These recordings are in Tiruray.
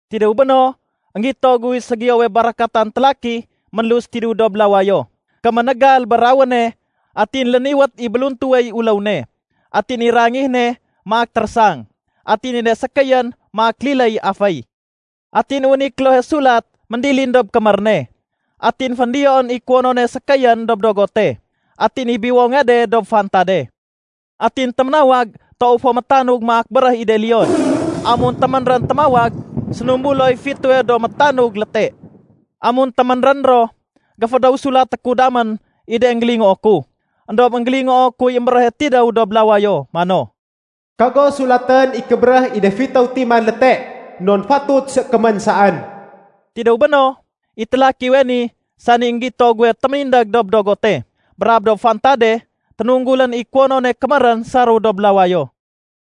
Tidéw béno, énggito guy ségiyowe barakatan télaki ménlus tidéw dob lawayo. Kéménégal bé rawéne atin léniwét i béluntuwey uléw ne. Atin i rangih ne maak térésang, atin i de sékéyén maak liléy aféy. Atin wén i klohe sulat méndilin dob kémér ne. Atin féndiyoén i kuwonone sékéyén dob dogote, atin i biwonge de dob fantade. Atin téménawag toow fo métanug maak béréh i de leon. Amun téménrén témawag, sénumbuloy fitéwe do métanug léte. Amun téménrén ro, géfédéw sulaté ku damén i de énggélingoo ku. Endob énggélingoo kuy émbéréhe tidéw dob lawayo mano, “Kago sulatén i kébéréh i de fitéw timan léte, non fatut sékémén saén.” Tidéw béno, i télakiwe ni, sani énggito guwe téménindég dob dogote brab dob fantade, ténunggulén i kuwonone kémérén saréw dob lawayo.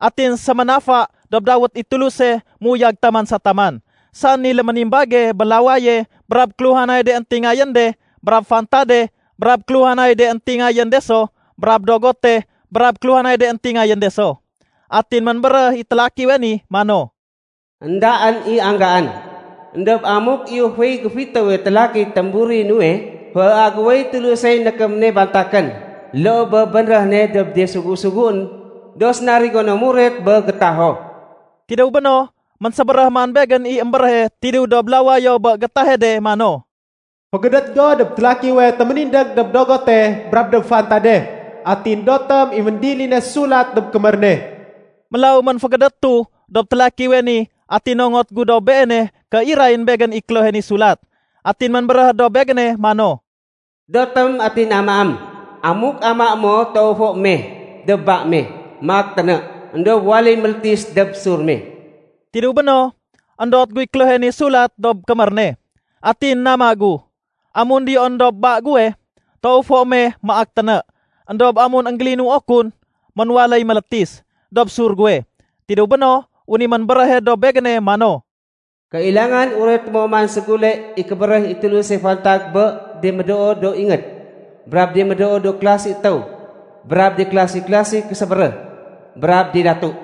Atin séménafa dob dawét i Tuluse méuyag taman sa taman, sani léménimbage bé lawaye brab kéluhanay de éntingayén de brab fantade brab kéluhanay de éntingayén de so brab dogote brab kéluhanay de éntingayén de so. Atin ménbéréh i télakiwe ni mano, “Endaén i anggaén! Endob amuk iyuféy géfitéwe télakiy témburi nuwe, féagéwéy Tulusey nékém ne bantakén, loo bé bénréh ne dob de sugu-suguén do sénarigo no muret bé gétaho.” Tidéw béno, ménsébéréh man begén i émbéréhe tidéw dob lawayo bé gétahe de mano, “Fégédét go dob télakiwe téménindég dob dogote brab dob fantade atin dotém i méndiline sulat dob kémér ne.” Mélaw ménfégédétu dob télakiwe ni atin nongot gu dob beene ké irayén begén i klohe ni sulat. Atin ménbéréh dob begéne mano, “Dotém atin amaém. Amuk amaé mo toow fo meh dob ba me maak téné, éndob waléy mélétis dob sur me.” Tidéw béno, éndot guy klohe ni sulat dob kémér ne, atin nama gu. Amun diyoén dob ba guwe, toow fo meh maak téné. Endob amun énggélinuo kun, ménwaléy mélétis dob sur guwe. Tidéw béno, wén i ménbéréhe dob begéne mano, “Kailangan ureté mo man ségule i kébéréh i Tuluse fantag bé de médoo do ingéd, brab de médoo do kélasi étéw, brab de klasi-klasi késébéréh, brab de datu.”